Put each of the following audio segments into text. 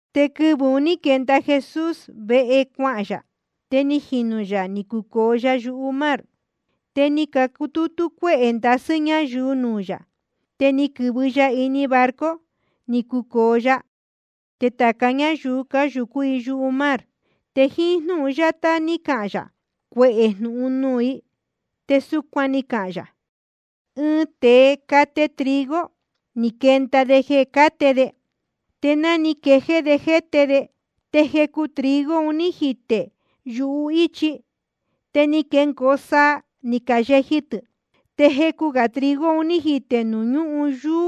Te quɨvɨ̄ un ní quenda Jesús vehe cuahān yā, te ni jinū yā ni cucōo ya yumar. Te ni cutútú cuéhē ndasɨ́ ñayuu nuū yā. Te ni quɨ̄vɨ ya ini ɨɨn barco, ni cucōo ya. Te tāca ñáyuu un cáyūcú i yumar. Te jíín jnúhun yátá ni cahān yā cuehē jnūhun nuū i, te súcuan ni cahān yā: Ɨɨn tēe cate trigo, ni quenda de jeē cáte de. Te ná ni quejéé de jéte de, te jecu trigo ni jitē yuhíchi. Te ni quecoo saa, ni cayeji tɨ̄. Te jecu gā trigo ni jitē nuū ñúhun yuū,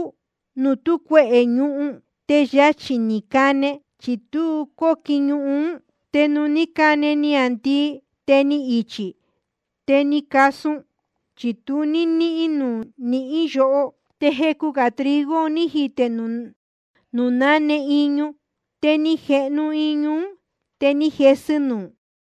nuū tú cuehē ñuhun. Te yachī‑ni ni cane, chi tu cóquin ñuhun. Te nuū ní cane niāndii, te ni ichī‑ni, te ni casun, chi tu ní níhín nuū quihín yoho. Te jecu gā trigo ni jitē nuū náne iñu. Te ni jehnu iñu ún, te ni jesɨ nuū.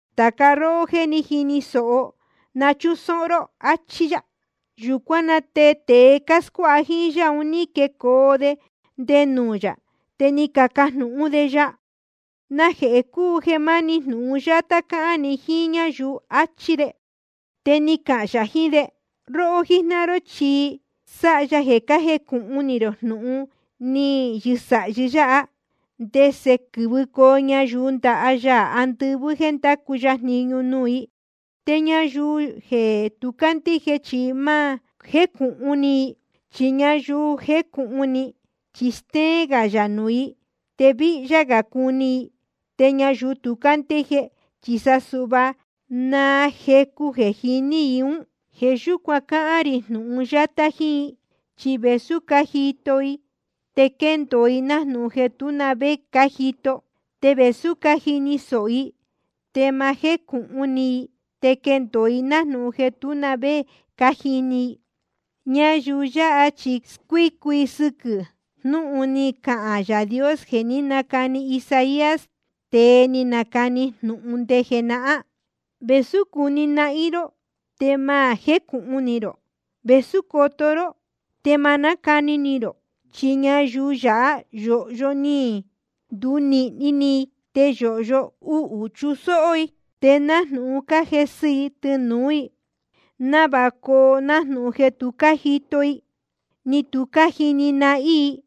Tāca róhó jéē jíni sōho, na chúsóhó ró. Achí yá. Yūcuán na te tēe cáscuáha jíín yá un ní quecoo de nde nuū yā, te ni cacajnūhún de ya: ¿Najehē cúu jeē máni jnūhun yátá cáhán ni jíín ñáyuu? achí de. Te ni cahān yā jiín de: Róhó jíjnáhan ró chi sáha ya jeē cájecūhun ni rō jnūhun ni yɨsāhi yáha, ndese quɨ́vɨcoo ñayuu ndaha Yaā andɨvɨ́ jeē ndacu ya jniñu nuū i. Te ñayuu yáha jéē tu cácandíje, chi ma jécūhun ni i. Chi ñayuu je jécūhun ni, chi stéén gā yā nuū i, te víhyá gā cuni i. Te ñayuu tu cándíje, sa suhva naa jecu jeē je jíní i ún. Jeē yúcuan cáhán rī jnūhun yátá jíín i. Chi vēsú cájito i, te quendōo i nájnūhun jeē tú na vé ni cájito i. Te vēsú cájini sōho i, te ma jécūhun ni i, te quendōo i nájnūhun jeē tú na vé ni cájini i. Ñayuu yāhá chi squícu sɨquɨ̄ i jnūhun ni cahān Yaā Dios jeē ní nacani Isaías, tēe ni nacani jnūhun nde jenahán: Vēsú cuni nahín ró, te ma jécūhun ni rō, te vēsú coto ró, te ma nácuni rō. Chi ñayuu yáha yōhyo ni ndunīhni ni i, te yōhyo uhū chusóhó i, te nájnūhun cájesɨ i tɨnūú i, návāha coo nájnūhun jeē tu cájito i, ni tu cájini nahín i,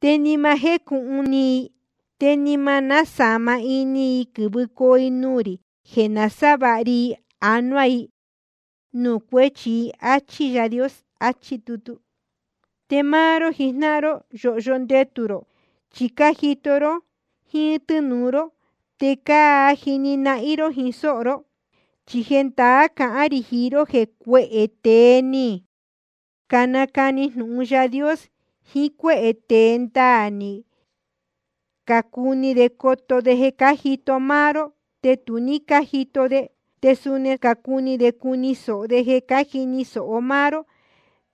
te ni ma jécūhun ni i, ni ma násāma ini i quɨ̄vɨcoo i nuū rī jeē nasávāha ri anuá i nuū cuéchi i. Achí Yaā Dios, achí tutu. ’Te máá ró jijnáhan ró, yōhyo ndetū rō, chi cájito ró jíín tɨ́nūu ró, te cájini nahín ró jíín sóho ró. Chi jendaá cahán rī jiín ró jeē cuehē tēe ni canacani jnūhun Yaā Dios jiín cuéhē tēe ndaā, ni cacuni de coto de jeē cájito máá ró, te tu ní cájito de. Te suni ni cacuni de cuni sōho de jeē cájini sōho máá ró,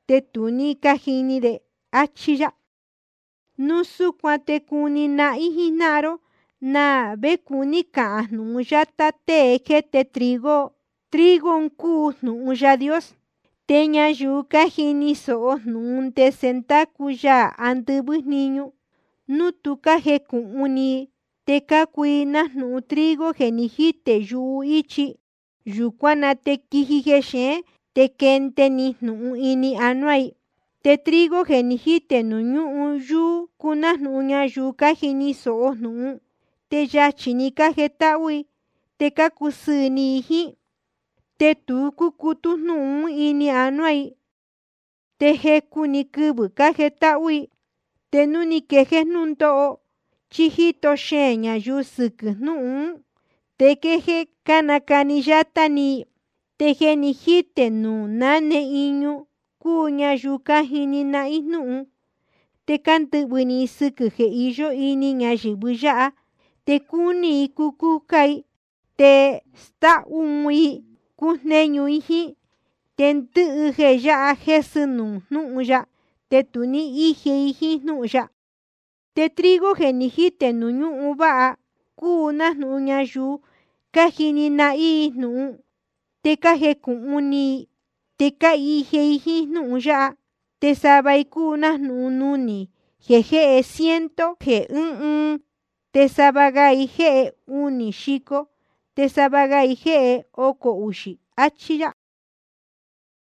te tu ní cájini de. Achí yá. ’Núu súcuan te cuni nahín jíjnáhan ró na vé cuní cahān jnūhun yátá tée jéte trigo: Trigo un cúu jnūhun Yaā Dios. Te ñayuu cájini sōho jnūhun ndese ndácu Yaā andɨvɨ́ jniñu, núu tu cájecūhun ni i te cácuu i nájnūhun trigo jeē ni jítē yuhíchi. Yūcuán na te quíji jexeén te quénde‑ni jnūhun ini anuá i. Te trigo jeē ni jítē nuū ñúhun yuū cúu nájnūhun ñayuu cájini sōho jnūhun, te yachī‑ni cájetáhú i te cácusɨɨ̄ ni i jíín. Te tu cúcutú jnúhun ún ini anuá i, te jecu‑ni quɨvɨ̄ cájetáhú i. Te núu ni quejéé jnúndóho, chí jíto xeēn ñayuu i sɨquɨ̄ jnúhun ún, te quéjéé nácani yátá ni i. Te jeē ni jítē nuū náne iñu cúu ñayuu cájini nahín jnúhun, te cándɨhvɨ̄ ni i sɨquɨ̄ jeē iyó ini ñayɨ̄vɨ yáha, te cúní i cucúcá i, te stáhú un i cujnéñu i jíín. Te ndɨhɨ jeē yáha jésɨ nuū jnúhun ya, te tu íje i jíín jnúhun ya. Te trigo jeē ni jítē nuū ñúhun váha cúu nájnūhun ñayuu cájini nahín jnúhun, te cájecūhun ni i, te cáhije i jíín jnúhun ya. Te sava i cúu nájnūhun nunī jeē jéhe ciento jeē ɨ́ɨn ɨɨn, te sava ga i jéhe unī xico, te sava ga i jéhe ocō uxī. Achí yá.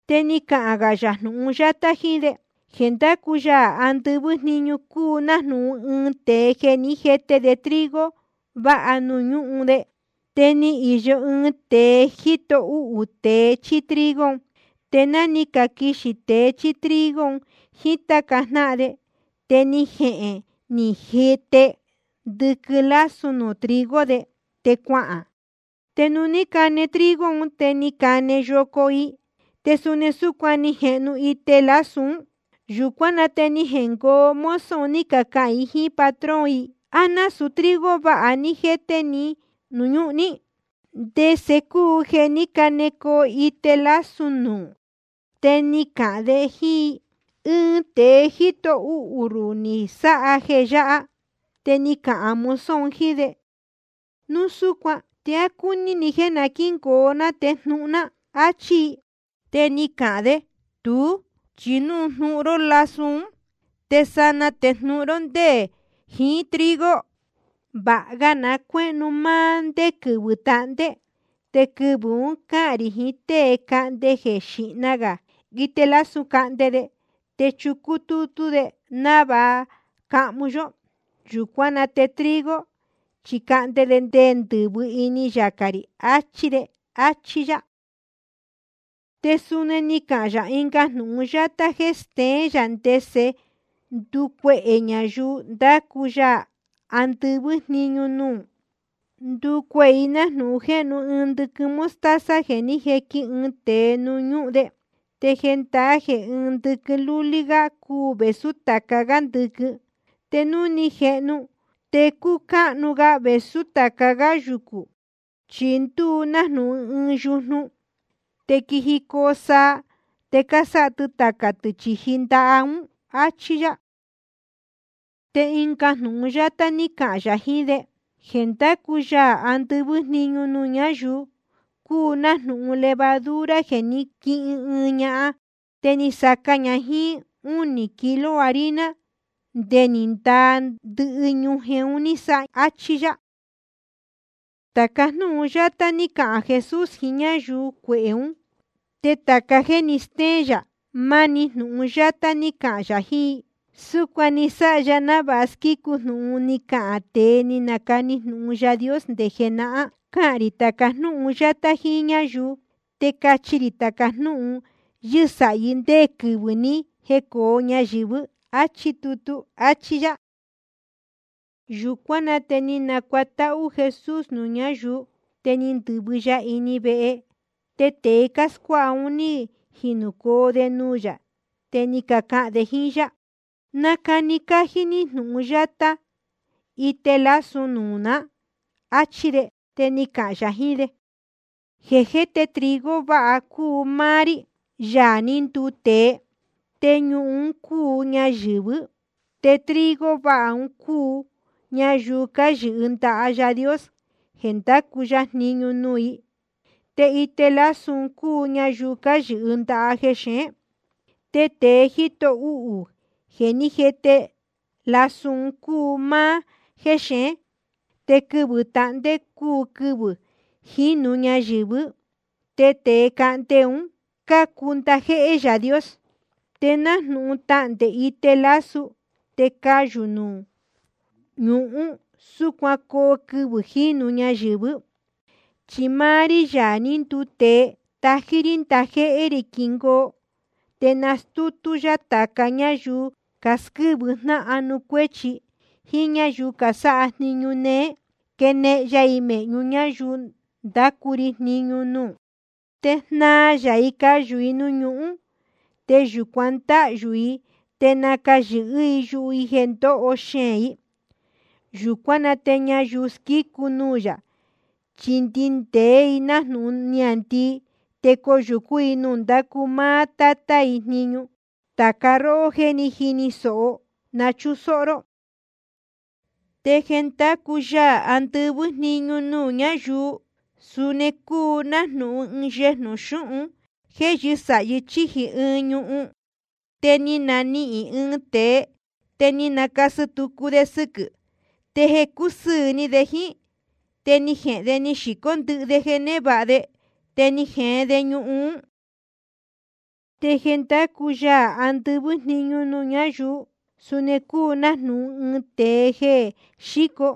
Te ni cahān yā ɨnga jnūhun yátá jíín de: Jeē ndácu Yaā andɨvɨ́ jniñu cúu nájnūhun ɨɨn tēe jeē ní jete de trigo váha nuū ñúhun de. Te íyó ɨɨn tēe jíto uhū de tēe chíí trigo. Te náa cáquixī tēe chíí trigo jiín táca jnáhan de, te ni jehēn ni jete ndɨquɨn lású nuū trigo de, te cuahān. Te nuū ní cane trigo ún, te ni cane yoco i, te suni súcuan ni jehnu ite lasú un. Yūcuán na te ni jengoo mozo ni cacahān i jíín patrón i: ¿A násūu trigo váha ní jéte ní núū ñúhun ní? ¿Te ndese cúu jeē ní canecoo ite lasú nuū? Te ni cahān de jíín i: Ɨɨn tēe jíto uhū ruhū ni sáha jeē yáha. Te ni cacahān mozo un jíín de: ¿Núu súcuan te á cúní ni jéē na quíngoo ná te jnuhun ná? áchí i. Te ni cahān de: Tuú, chi núu jnuhun ró lású un te sanaa te jnuhun ró ndé jiín trigo. Vāha ga na cuéhnu máá ndé quɨvɨ̄ tahndé. Te quɨvɨ̄ un cáhān rī jiín tée cahnde jeē xīhna gā ite lasú cahnde de, te chucú tútú de návāha cahmu yó. Yūcuán na te trigo chi cahnde de ndɨ̄vɨ ini yacā rī, achí de. Áchí yá. Te suni ni cahān yā ɨnga jnūhun yátá jéē steén yā ndese ndúcuehē ñayuu ndácu Yaā andɨvɨ́ jniñu nuū: Ndúcuehē i nájnūhun jéhnu ɨɨn ndɨquɨn mostaza jeē ní jequin ɨɨn tēe nuū ñúhun de. Te jendaá jeē ɨɨn ndɨquɨn lúlí gá cúu vēsú tāca gá ndɨquɨn. Te núu ni jehnu, te cúu cáhnu ga vēsú tāca gá yucū, chi ndúu nájnūhun ɨɨn yujnu. Te quíjicoo saa, te cásáha tɨ tacā tɨ̄ chīji ndaha ún. Achí yá. Te ɨnga jnūhun yátá ní cahān yā jiín de: Jeē ndácu Yaā andɨvɨ́ jniñu nuū ñáyuu cúu nájnūhun levadura jeē ní quihin ɨɨn ñahan. Te ni saca ña jíín únī kilo harina, nde ni ndaa ndɨhɨ ñujen ni sáha. Achí yá. Tāca jnúhun yáha ní cahān Jesús jiín ñáyuu cuehē ún. Te tāca jéē ni stéén yā, máni jnūhun yátá ní cahān yā jiín i. Súcuan ni sáha ya návāha squícu jnūhun ni cahān tēe ni nacani jnūhun Yaā Dios nde jenahán: Cahān rī tāca jnúhun yátá jíín ñáyuu, te cachi rī tāca jnúhun yɨ́sāhí ndé quɨvɨ̄ ní jecōo ñayɨ̄vɨ́. Achí tutu, áchí yá. Yūcuán na te ni nacuatáhú Jesús nuū ñáyuu. Te ni ndɨ̄vɨ ya ini vehe. Te tēe cáscuáha un ní jinūcoo de nuū yā, te ni cacahān de jíín yá: Nacani cájí ní jnūhun yátá ite lasú nuū ná, áchí de. Te ni cahān yā jiín de: Jeē jéte trigo vāha un cúu máá rí, Yaā ní nduu tēe. Te ñuhun un cúu ñayɨ̄vɨ́. Te trigo vāha un cúu ñayuu cáyɨhɨ ndaha Yaā Dios jeē ndácu ya jniñu nuū i. Te ite lasú un cúu ñayuu cáyɨhɨ ndaha jexeén. Te tēe jíto uhū jeē ní jete lasú un cúu máá jéxeén. Te quɨvɨ̄ tahndé cúu quɨvɨ̄ jínu ñayɨ̄vɨ́. Te tēe cahnde un cácuu ndajéhé Yaā Dios. Te nájnūhun tahndē ite lasú te cayū nuū ñuhún, súcuan coo quɨvɨ̄ jínu ñayɨ̄vɨ́. Chi máá rí, Yaā ní nduu tēe, tají rí ndajéhé rī quingoo. Te nastútú yá tāca ñáyuu casquɨ́vɨ jnáhan nuū cuéchi, jíín ñáyuu casáha jniñu néé, quenehen ya i mēhñu ñáyuu ndácu ri jniñu nuū. Te jnaa ya i cayū i nuū ñuhún. Te yūcuan ndáhyū i te nacayɨ̄hɨ́ yuhu i jeē ndoho xeēn i. Yūcuán na te ñayuu squícu nuū yā chi ndindēé i nájnūhun niāndii, te coyūcú i nuū ndácu máá Tátá i jniñu. Tāca róhó jéē jíni sōho, na chúsóhó ró. ’Te jeē ndácu Yaā andɨvɨ́ jniñu nuū ñáyuu, suni cúu nájnūhun ɨɨn yejnū xūhún jeē yɨ́sāhi chíji ɨɨn ñuhun. Te ni nanihīn ɨɨn tēe, te ni nacasɨ tucu de sɨquɨ̄. Te jeē cúsɨɨ̄ ni de jíín, te ni jehēn de ni xīcó ndɨhɨ de jeē névāha de, te ni jeen de ñuhun ún. ’Te jeē ndácu Yaā andɨvɨ́ jniñu nuū ñáyuu, suni cúu nájnūhun ɨɨn tēe jéen xíco,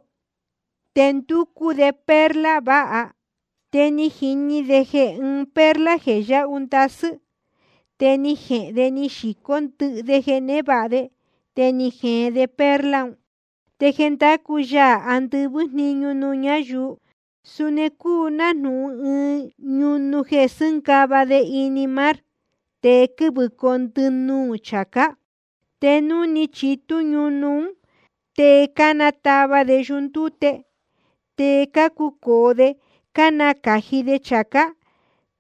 te ndúcú de perla váha. Te ni jini de ɨɨn perla jeē yáhu ndasɨ́, te ni jehēn de ni xīcó ndɨhɨ de jeē névāha de, te ni jeen de perla un. ’Te jeē ndácu Yaā andɨvɨ́ jniñu nuū ñáyuu, suni cúu nájnūhun ɨɨn ñunu jeē cásɨ́ngava de ini mar, te quɨ́vɨcoo ndɨnuū chācá. Te núu ni chitú ñunu ún, te cánatava de yundúte. Te cácucōo de cánacāji de chācá.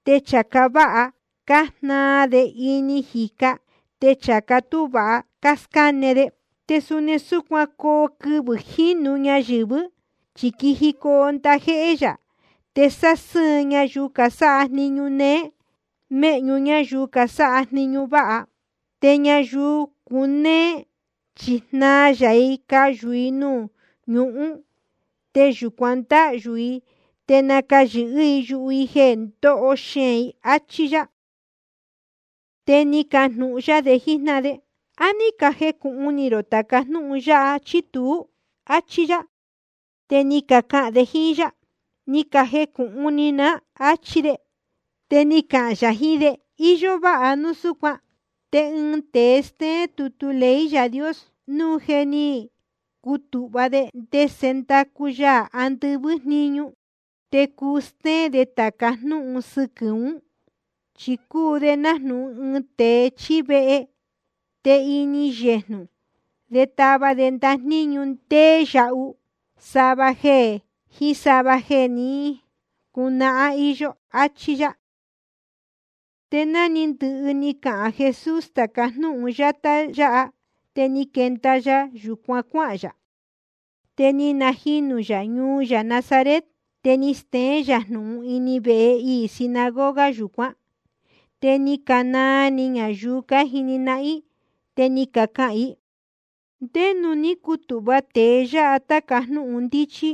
Te chācá váha cájnaa de ini jīca, te chācá tú vāha cáscáne de. Te suni súcuan coo quɨvɨ̄ jínu ñayɨ̄vɨ́. Chi quijicoo ndajéhé yā, te sásɨ́ɨn ya ñayuu casáha jniñu néé méhñu ñáyuu casáha jniñu váha. Te ñayuu cunéé chi jnaa ya i cayū i nuū ñuhún. Te yūcuan ndáhyū i te nacayɨ̄hɨ́ yuhu i jeē ndoho xeēn i. Achí yá. Te ni cajnūhun yá de jíjnáhan de: ¿A ní cajecūhun ni rō tāca jnúhun yáha, chí tuú? áchí yá. Te ni cacahān de jíín yá: Ni cajecūhun ni ná, áchí de. Te ni cahān yā jiín de: Iyó váha núu súcuan. Te ɨɨn tēe stéén tutu ley Yaā Dios, núu je ni cutūhva de ndese ndácu Yaā andɨvɨ́ jniñu, te cuu stéén de tāca jnúhun sɨquɨ̄ ún. Chi cúu de nájnūhun ɨɨn tēe chíí vehe. Te ini yejnū de táva de ndajníñu ndéé yahu, sava jeē jeé jíín sava jeē je ni cunahán íyó. Achí yá. Te ná ni ndɨhɨ ni cahān Jesús tāca jnúhun yátá yáha, te ni quenda ya yūcuan cuáhān yā. Te ni najinū yā ñuu yā Nazaret. Te ni steén yā jnūhun ini vehe iī sinagoga yūcuán. Te ni canaa ni ñayuu cájini nahín i, te ni cacahān i: ¿Ndé nuū ní cutūhva tēe yáha tāca jnúhun ndíchí?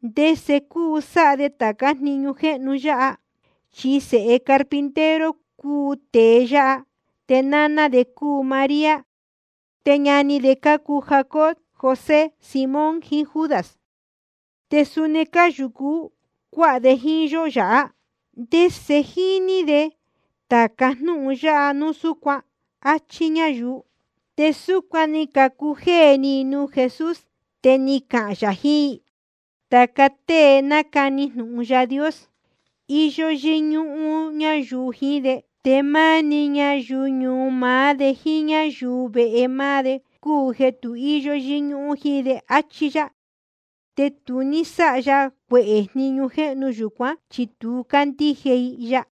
¿Te ndese cúu sáha de tācá jniñu jéhnu yāhá? Chi sēhe carpintero cúu tēe yáha, te náná de cúu María, te ñani de cácuu Jacobo, José, Simón, jiín Judas. Te suni cáyūcu cuáha de jíín yó yāhá. ¿Te ndese jíní de tāca jnúhun yáha núu súcuan? Achí ñayuu. Te súcuan ni cacujéē ni i nuū Jesús. Te ni cahān yā jiín i: Tāca tée nácani jnūhun Yaā Dios, íyó yɨ́ñúhún ñayuu jiín de, te máni ñayuu ñuu maá de jíín ñáyuu vehe máá de cúu jeē tu íyó yɨ́ñúhún jíín de. Achí yá. Te tu ní sáha ya cuehē jniñu jéhnu yūcuán, chi tu cácandíje i ya.